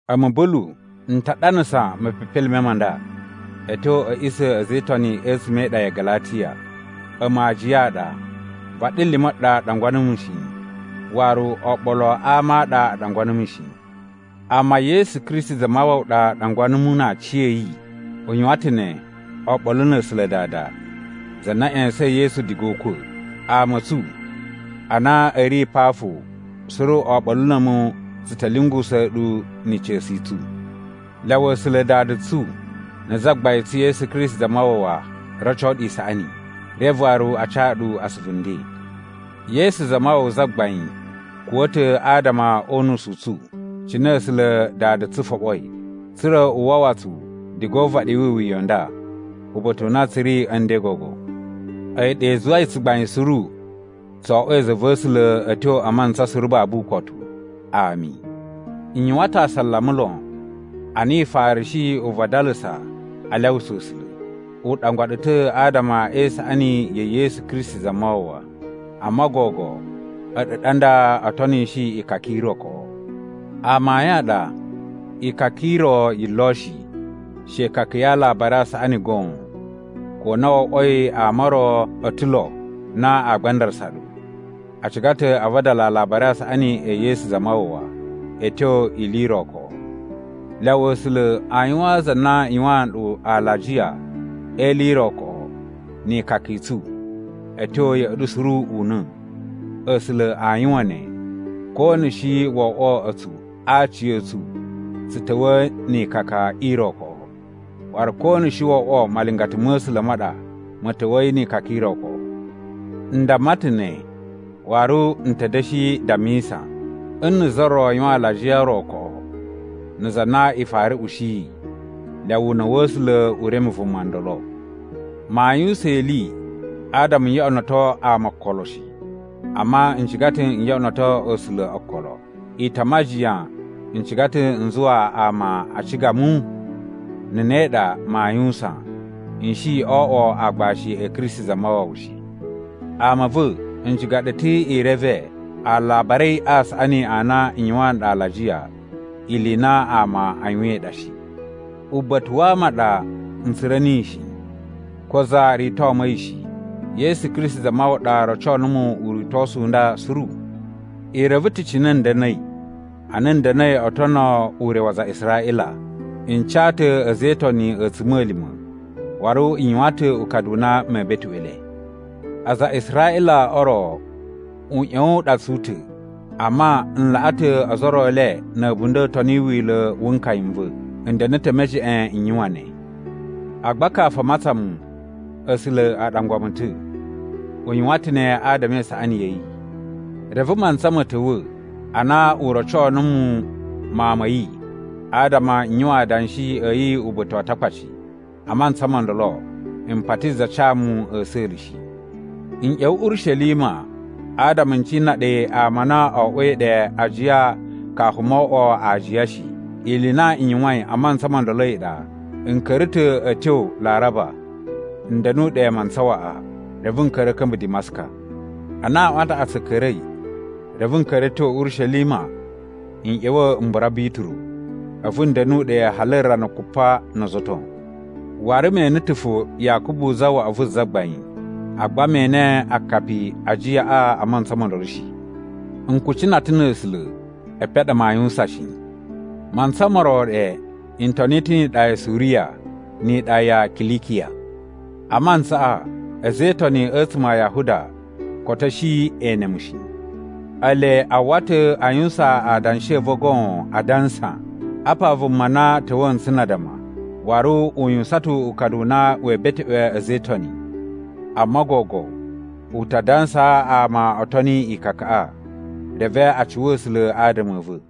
A̱mu, Bulu, n ta ɗanasa mepepelime ma nda a̱ tyo a̱ a̱ꞌisa̱ a̱ a̱za̱ e Itoni a̱tsuma̱ e iɗa ya Galatiya. A̱mu aajiya a ɗa. Vaɗilima̱ ɗa ɗangwa numu shi. Waru oɓolo a ama a ɗa a ɗangwa numu shi. Amma Yesu Kristi Zamawawa ɗa ɗangwa numu na aciya̱yi. U yuwan ta̱ ne oɓolo na̱ A̱sula̱ Dada, za na ꞌya̱sa̱in Yesu diga o ukwa̱. Ama a̱ tsu a na a̱ ri pa fo suru oɓolo na̱ a̱mu tsu ta̱ lyungusa̱a̱ ɗu ni ica̱su i tsu. Lyawa A̱sula̱ Dada tsu na̱ Zagbain tsu Yesu Kristi Zamawawa roco ɗu isaꞌani, reve waru a ca ɗu asuvu nden. Yesu Zamawawa Zagbain kuwa̱ ta̱ adama o unusu u tsu, cine A̱sula̱ Dada tsu foɓoi, tsa̱ra̱ u wawa tsu diga o uvaɗi wi iwuya i nda uba̱ta̱ u na tsu ri a̱ nden gogo. A̱yi ɗa i zuwai tsugbain suru tso oꞌwoi za va̱ A̱sula̱ a̱ tyo a mantsa suru babu ukotu. Ami. N yuwan ta̱ asalama lon a na i farashi uvadalasa a lyawusa A̱sula̱. U ɗangwa ɗu ta̱ adama e isaꞌani ya̱ Yesu Kristi Zamawawa. Amma gogo a̱ɗu ɗa nda o tonishi ikaka i ro koꞌo. Amayun a ɗa, ikaka i ro yi lo shi, she ikaka ya Alabari a Saꞌani goon, ko na wo oꞌwoi ama o ro o ta̱ lo na a gbandarasa ɗu. A ciga ta̱ a vadala a Alabari a Saꞌani e Yesu Zamawawa a̱ tyo ili i ro koꞌo. Lyawa A̱sula̱ a yuwaan za na yuwaan nɗu alajiya e ili i ro koꞌo ni ikaka i tsu a̱ tyo ya̱ꞌa̱ ɗu suru una̱! A̱sula̱ a yuwan ne, ko na̱ shi wo oꞌwo a̱tsu a aciya̱tsu tsu ta̱wa̱a̱ ni ikaka i ro koꞌo, waru ko na̱ shi wo oꞌwo malingata ma̱ A̱sula̱ ma ɗa ma̱ ta̱wa̱yi ni ikaka i ro koꞌo. N damma ta̱ ne, waru n ta̱ da̱shi dammisa: Nna̱ za ro yuwan alajiya o ro koꞌo na̱ za na i fara ushiyi, lyawa una̱ wa̱ A̱sula̱ u reme vuma ndolo. Maa yuwusan ili adama n yoꞌonoto ama okolo shi. Amma n ciga ta̱ n yoꞌonoto A̱sula̱ okolo. I ta majiyan n ciga ta̱ n zuwa ama a ciga mu? Na̱ ne ɗa maa yuwusan, n shi o oꞌwo aagbashi a̱ Kristi Zamawawa shi. Ama a̱ va̱, n ciga ɗu ta̱ i reve Alabari a Saꞌani a na n yuwaan ɗu alajiya, ili i na ama a yuwain ɗa shi. Uba̱ta̱ wa ama a ɗa n tsura̱ niyi shi. Ko za rito mu a̱yi shi. Yesu Kristi Zamawawa ɗa roco numu uritosu u nda suru. I reve ta̱ cine n da̱na̱i ana n da̱na̱i o tono ure wa aza a Israꞌila. N ca ta̱ a̱za̱ e Itoni a̱tsuma̱lima̱ waru n yuwan ta̱ ukadu u na mee beteꞌwe le. Aza a Israꞌila o ro uꞌyowun u ɗa tsu ta̱, amma n laꞌa ta̱ ozo o ro e le na̱ a̱bunda̱ toni wila̱ wu nkaya n va̱. N da̱na̱ ta̱ e mejeꞌen n yuwan ne. Agba kafu a matsan mu, A̱sula̱ a ɗangwa mu ta̱. U yuwan ta̱ ne adama e isaꞌani ya̱ yi. Reve mantsa ma̱ ta̱wa̱ ana u roco numu Mawun ma̱ yi adama n yuwan adanshi a̱ yi uba̱ta̱ wa Atakpaci. A mantsa mo ndolo, m pati za ca mu a̱sa̱la̱ shi. N ꞌya̱wa̱ Urishelima adama n cina ɗe ama a na o oꞌwoi ɗe ajiya kafu mo oꞌwo aajiya shi. Ili i na n yuwain a mantsa mo ndolo a̱yi ɗa, n ka̱ra̱ ta̱ a̱ tyo Laraba n da̱nu ɗe mantsa waꞌa. Reve n ka̱ra̱ a̱ ka̱mba̱ Dimaska. Ana aꞌwan a taꞌatsu a̱ ka̱ra̱i, reve n ka̱ra̱ a̱ tyo Urishelima n ꞌya̱wa̱ m bura Bituru, a̱vu n da̱nu ɗe hali rana kupa no ozo o ton. Waru me ene ta̱ fo Yakubu zawaꞌa vu Zagbain, agba me ene akapi a ajiyaꞌa a mantsa mo ndolo shi. N kucina ta̱ na̱ A̱sula̱, epen a ɗa maa yuwusan shi. Mantsa mo ro ɗe, n toni ta̱ ni iɗa ya Suriya ni iɗa ya Kilikiya. A mantsaꞌa a̱za̱ e Itoni a̱tsuma̱ a Yahuda koto a̱ shi e ene mu shi. Ele a uwwa ta̱ a yuwusan adanshi a̱ va̱ goon adansa: “Apa vuma na ta̱wa̱a̱ ntsu na addama, waru u yuwusan ta̱ ukadu u na wee beteꞌwe a̱za̱ e Itoni. Amma gogo u ta dansaa ama o toni ikakaꞌa.” Reve a cuwa A̱sula̱ adama a̱ va̱.